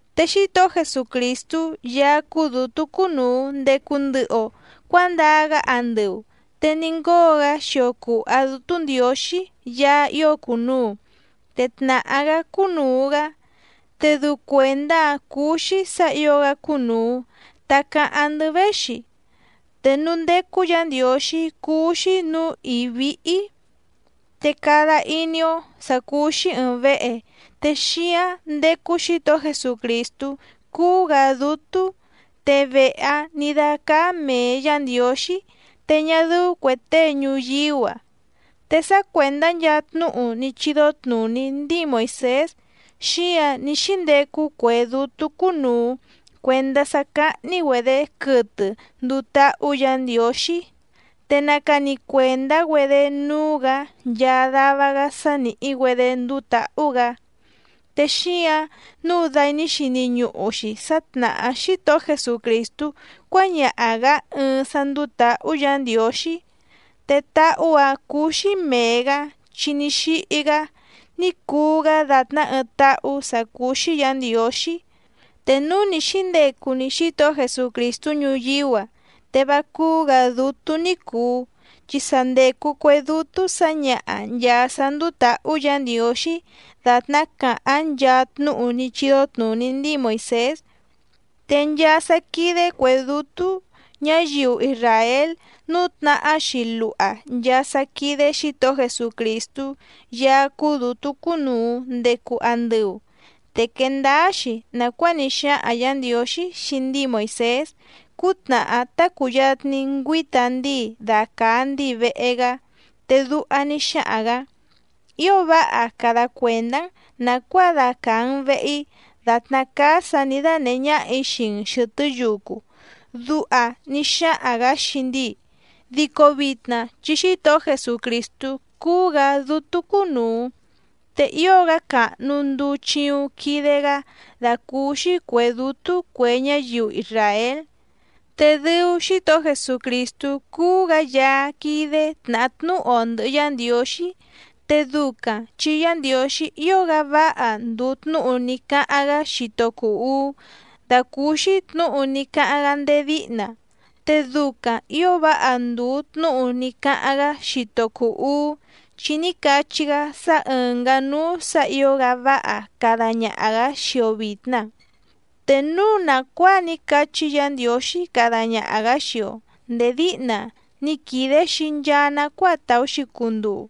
Te Xítohó Jesucrìstú Yaá cúú dǔtú cúnùu ndecu ndɨhɨ‑o cuándaa‑gá andɨu, te ní ngóo‑gá xio cùha Dútú Ndiǒxí Yaá ío cùnuu, te tnàhá‑gá cúnùu‑gá. Te dɨu cuèndá‑a cùu‑xi sá ǐo‑gá cúnùu ta cáháⁿ‑ndɨ́ véxi. Te núú ndécú Yǎ Ndiǒxí cúú‑xí nǔú ìí víhí. Te cada iní‑ó sǎ cúú‑xí ɨ̀ɨⁿ vehe te xíáⁿ ndécú Xǐtohó Jesucrìstú cúú‑gǎ dútú, te vehe‑áⁿ nǐ dácáá mèe Yá Ndiǒxí te ñá dɨ́ú cuè tée ñuyíú‑a. Te sá cuèndá nchaa tnúhu ní chídó tnùní ndíi Moìsés xíǎⁿ ní xíndecu cue dútú cúnùu cuendá sá cáhní‑güedě quɨtɨ nduu táhú Yǎ Ndiǒxí, te nacani cuèndá‑güedé núú‑gǎ nchaa dava‑gá sá nìhí‑güedé nduu táhú‑gǎ. Te xíǎⁿ nǔu dai ní xini ñuhu‑xi sá tnàhá Xítohó Jesucrìstú cuáñaha‑gǎ ɨɨⁿ sá ndúú tǎhú Yǎ Ndiǒxí, te táhú‑ǎⁿ cúú‑xí mèe‑gá chi ní xíhí‑gá ní cuu‑gá dàtná ɨɨⁿ táhú sǎ cúú‑xí Yǎ Ndiǒxí. Te núu ni xǐndecu‑ni Xítohó Jesucrìstú ñuyíú‑a te vá cúú‑gǎ dútú ní cùu, chi sa ndècu cue dútú sǎñaha nchàa sá ndúú tǎhú Yǎ Ndiǒxí dàtná càháⁿ nchaa tnúhu ní chídó tnùní ndíi Moìsés. Te nchaa sá quídé cuè dútú ñǎyiu isràél nǔtnahá‑xi luha nchaa sá quídé Xǐtohó Jesucrìstú Yaá cúú dǔtú cúnùu ndecu andɨu. Te quèe ndáá‑xi nàcuáa ní xáhaⁿ Yǎ Ndiǒxí xii ndíi Moìsés cútnàhá tá cùyatni ngüíta ndíi dacàa ndíi vehe‑gá, te duha ní xáhaⁿ‑gǎ: “Ío váha cada cuèndá‑n nàcuáa dacàa‑n vehe‑í dàtná cáá sǎ nǐ dánèhé ñáhà‑í xii‑n xɨ̀tɨ́ yucu”, duha ní xáhaⁿ‑gǎ xii ndíi. Dico vitna chi Xítohó Jesucrìstú cúú‑gǎ dútú cúnùu, te ío‑gá càhnu nduu chiuⁿ quide‑gá dàcúúxí cuè dútú cue ñáyiu isràél. Te dɨu Xítohó Jesucrìstú cúú‑gǎ Yaá quídé tnàhá tnúhu‑o ndɨ̀hɨ Yá Ndiǒxí, te ducaⁿ chi Yá Ndiǒxí ío‑gá váha ndùu tnúhu ní cáháⁿ‑gá xito cùu uú dàcúúxí tnǔhu ní cáháⁿ‑gá ndéé díhna, te ducaⁿ ǐo váha ndùu tnúhu ní cáháⁿ‑gá xito cùu uú chi ní cachí‑gá sá ɨ̀ngá núú sǎ ǐo‑gá váha cada ñaha‑gǎ xii‑o vìtna. Te núu nàcuáa ní cachí Yǎ Ndiǒxí cada ñaha‑gǎ xii‑o ndèé díhna ni quìde‑xi nchaa nacuáa tàú‑xi cunduu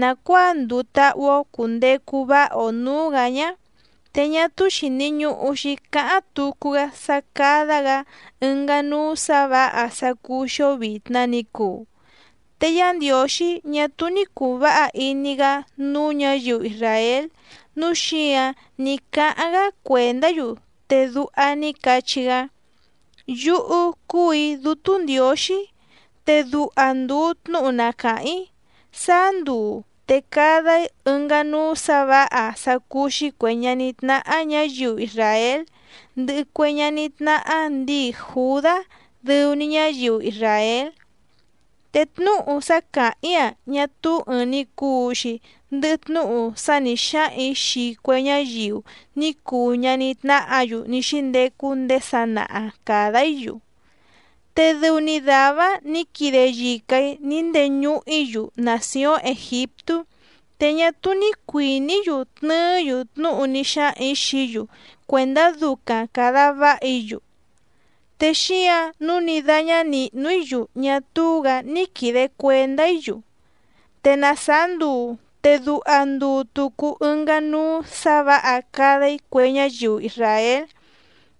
nàcuáa nduu táhú‑ó cùndecu váha‑o nǔú‑gǎ ñá, te ñá túú xìni ñuhu‑xi cáháⁿ tucu‑gá sá cádá‑gǎ ɨngá núú sǎ vǎha sá cúú‑xí‑ó vìtna ni cuu. Te Yá Ndiǒxí ñá túú ní cùu váha iní‑gá núú ñǎyiu isràél nǔu xíǎⁿ ní cáháⁿ‑gá cuèndá‑yu, te duha ní cachí‑gá: Yúhú cúù‑í Dútú Ndiǒxí, te duha ndùu tnúhu na càháⁿ‑í: Sáá nduu te cada‑í ɨngá núú sǎ vǎha sá cúú‑xí cuè ñaní tnáhá ñǎyiu isràél, ndɨhɨ cue ñaní tnáhá ndǐi Jùdá dɨu‑ni ñáyiu isràél. Te tnúhu sá càháⁿ‑í‑a ñá túú ɨ̀ɨⁿ‑ni cuu‑xi ndɨhɨ tnúhu sá nǐ xáhaⁿ‑ǐ xii cue ñáyiu ní cuu ñaní tnáhǎ‑yu ní xíndecu ndéé sanaha càda‑í‑yu, te dɨu‑ni dàvá‑áⁿ nǐ quide yica‑ǐ ní ndeñuhu‑í‑yu nàcióⁿ Ègiptú, te ñá túú ní cuìní‑yu tnɨɨ́‑yu tnúhu ní xáhaⁿ‑ǐ xií‑yu cuèndá ducaⁿ càda váha‑í‑yu, te xíǎⁿ nǔu ní dáñá nìhnu‑í‑yu ñá túú‑gǎ ní quìde cuendá‑í‑yu. Te na sàá nduu te duha ndùu tucu ɨngá núú sǎ vǎha cada‑í cue ñáyiu isràél.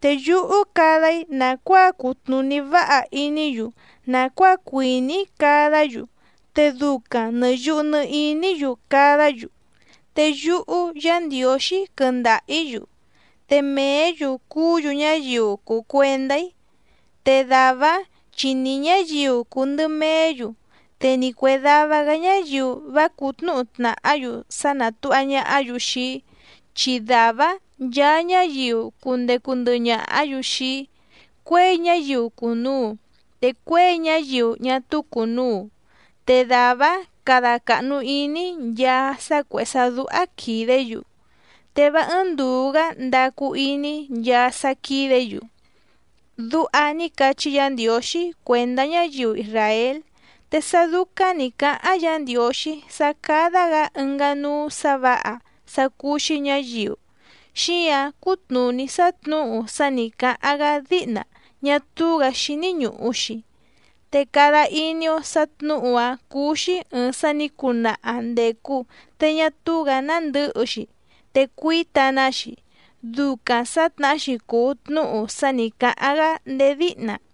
Te yúhú cada‑í nàcuáa cutnùní váha iní‑yu nàcuáa cuìní‑í cadá‑yu, te ducaⁿ nɨ̀ yuhu nɨ iní‑yu cadá‑yu. Te yúhú Yǎ Ndiǒxí quɨndaha‑ǐ‑yu, te mèé‑yu cuú‑yu ñáyiu cùu cuendá‑í. Te dàvá‑áⁿ chi ni ñǎyiu cùu ndɨ meé‑yu, te ni cuè dava‑gá ñáyiu vá cǔtnǔhu tnàhá‑yu sá nátùha ñahá‑yu xii‑í, chi dàvá‑áⁿ nchaa ñáyiu cundecu ndɨhɨ ñàhá‑yu xii‑í, cuěi ñáyiu cùnuu te cuěi ñáyiu ñá túú cùnuu. Te dàvá‑áⁿ cada càhnu iní‑í nchaa sá cuèhé sá dúhá quìdé‑yu, te vá ɨ́ɨ́ⁿ ndùu‑gá ndacu iní‑í nchaa sá quídě‑yu. Duha ní cachí Yǎ Ndiǒxí cuèndá ñáyiu isràél. Te sá dúcáⁿ nǐ cáháⁿ Yǎ Ndiǒxí sá cádá‑gǎ ɨngá núú sǎ vǎha sá cúú‑xí ñǎyiu xíǎⁿ cútnùní sá tnǔhu sá nǐ cáháⁿ‑gá díhna ñá túú‑gǎ xíní ñùhu‑xi. Te cada iní‑ó sǎ tnǔhu‑áⁿ cúú‑xí ɨ̀ɨⁿ sá nǐ cunaha ndècu te ñá túú‑gǎ nándɨ̌hɨ‑xi te cuíta‑ná‑xi, ducaⁿ sǎtnahá‑xi cùu tnúhu sá nǐ cáháⁿ‑gá ndéé díhna.